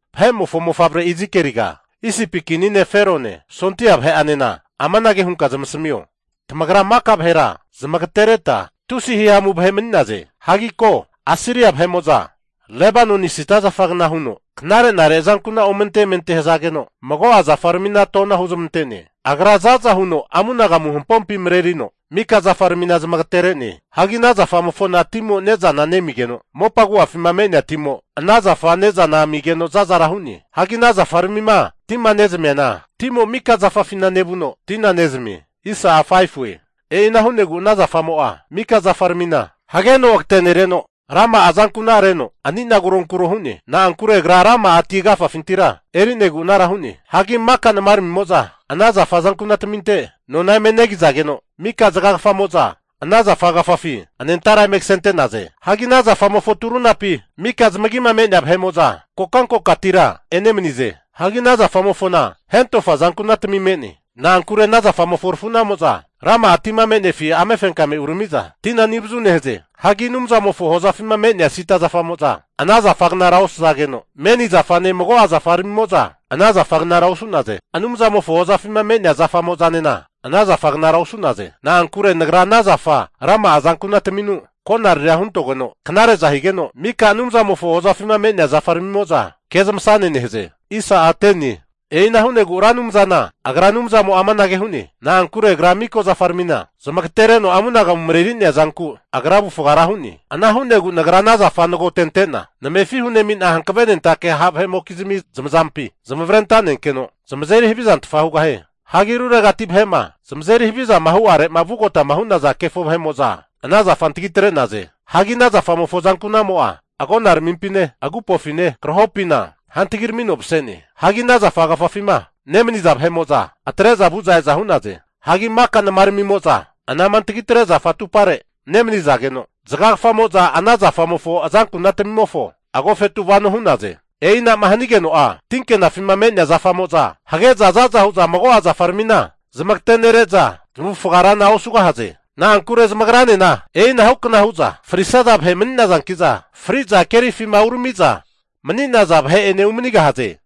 Vahe'mofo mofavre Izikieliga, Isipi kini ne' Ferone sondia vahe'anena amanage hunka zamasamio, tamagra mika vahera zamagatereta, tusi hihamu vahe mani'naze. Hagi ko, Asiria vahe'mo'za Lebanoni sida zafagna hu'za knare'nare azankuna omente amente hazageno mago'a zafaramina tona huzmantene. Agra za'za huno amunagamu hampompi marerino, mika zafaramina zamagatere'ne. Hagi ana zafamofona timo ne'zana nemigeno, mopa agu'afima me'nea timo ana zafa ne'zana amigeno zazara hu'ne. Hagi ana zafaramima tima ne'zamiana, timo mika zafafina nevuno tina nezamie. E'ina hunegu ana zafamo'a mika zafaramina hageno agatenereno, rama'a azanku'nareno ani'na kuronkuro hu'ne. Na'ankure agra rama'a ti agafafintira eri'negu anara hu'ne. Hagi maka namaramimo'za ana zafa azankunataminte nona eme negizageno, mika zaga kafamo'za ana zafa agafafi anentara eme kasente'naze. Hagi ana zafamofo turunapi mika zamagima me'nea vahe'mo'za kokantegatira enemanize. Hagi ana zafamofona hentofa azankunatmi me'ne. Na'ankure ana zafamofo arafu'namo'za rama'a tima me'nefi amefenkame urami'za tina ani avazu nehaze. Hagi Anumzamofo hozafima me'nea sida zafamo'za ana zafa gnara osazageno, meni zafane mago'a zafaramimo'za ana zafa gnara osu'naze. Anumzamofo hozafima me'nea zafamo'zanena ana zafa gnara osu'naze. Na'ankure Nagra ana zafa rama'a azankunataminu konariria huntogeno knare'za higeno, mika Anumzamofo hozafima me'nea zafaramimo'za kezmasane nehaze. E'ina hu'negu Ra Anumzana Agra Anumzamo'a amanage hu'ne, Na'ankure agra mika zafaramina zamagatereno amunagamuma mareri'nea zanku agra avufga ra hu'ne. Ana hu'negu Nagra ana zafa nagotente'na namefi hunemina hankavenentake ha' vahe'mokizmi zamazampi zamavare antanenkeno, zamazeri havizantfa hugahie. Hagi ruregati vahe'ma zamazeri haviza hu'arema vugota hu'naza kefo vahe'mo'za ana zafa antagi atre'naze. Hagi ana zafamofo azankuna'mo'a agonaramimpine, agupofine, krahopina hantagiramino mase'ne. Hagi ana zafa agafafima nemaniza vahe'mo'za atre'za vu'za e'za hu'naze. Hagi maka namaramimo'za anama antagitre zafa atupare nemanizageno, zagagafamo'za ana zafamofo azankunatamimofo agofetu vano hu'naze. E'inama hanigeno'a tinkenafima me'nea zafamo'za hage'za zaza hu'za mago'a zafaramina zamagate'nere'za zamavufaga rana osugahaze. Na'ankure zamagranena e'inahu kna hu'za frisaza vahe mani'nazanki'za, fri'za kerifima urami'za mani'naza vahe'ene umanigahaze.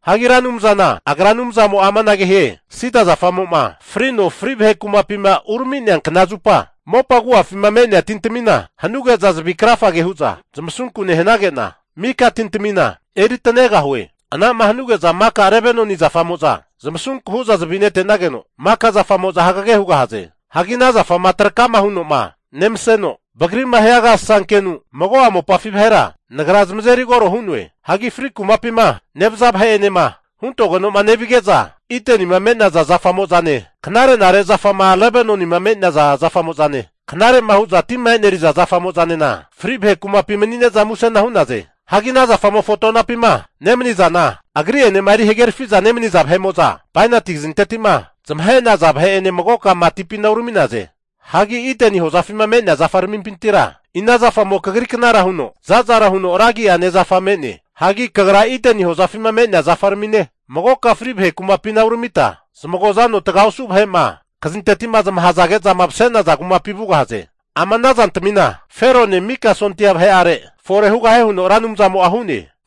Hagi Ra Anumzana Agra Anumzamo'a amanage hie, sida zafamo'ma frino fri vahe kumapima urami'nea kna zupa, mopa agu'afima me'nea tintamina hanuge'za zavi krafa hu'za zamasunku nehanage'na, mika tintamina eri tanegahue. Anama hanige'za maka Lebanoni zafamo'za zamasunku huza zavi nete'nageno maka zafamo'za hagege hugahaze. Hagi ana zafama trakama huno'ma nemaseno vagri'ma hia agasasa kenu mago'a mopafi vahera Nagra zamazeri koro hu'noe. Hagi fri kumapima nevaza vahe'enema huntoge'noma nevige'za, Idenima me'naza zafamo'zane knare'nare zafama Lebanoni me'naza zafamo'zane, knare'ma hu'za tima e'neriza zafamo'zanena fri vahe kumapi mani'ne'za musena hu'naze. Hagi ana zafamofo tonapima nemaniza, agri'enema erigaherafiza nemaniza vahe'mo'za bainati kazinteti'ma zamahe'naza vahe'ene magoka matipina urami'naze. Hagi Ideni hozafima me'nea zafaramimpintira ina zafamo kagri knara huno za'zara huno ragi'ane zafa me'ne? Hagi kagra Ideni hozafima me'nea zafaramine, magoka fri vahe kumapina uramita zamagoza anoma taga osu' vahe'ma kazinteti'ma zamahazage'zama mase'naza kumapi vugahaze. Ama ana zantamina Ferone mika sondia vahe'are fore hugahie huno Ra Anumzamo'a hu'ne.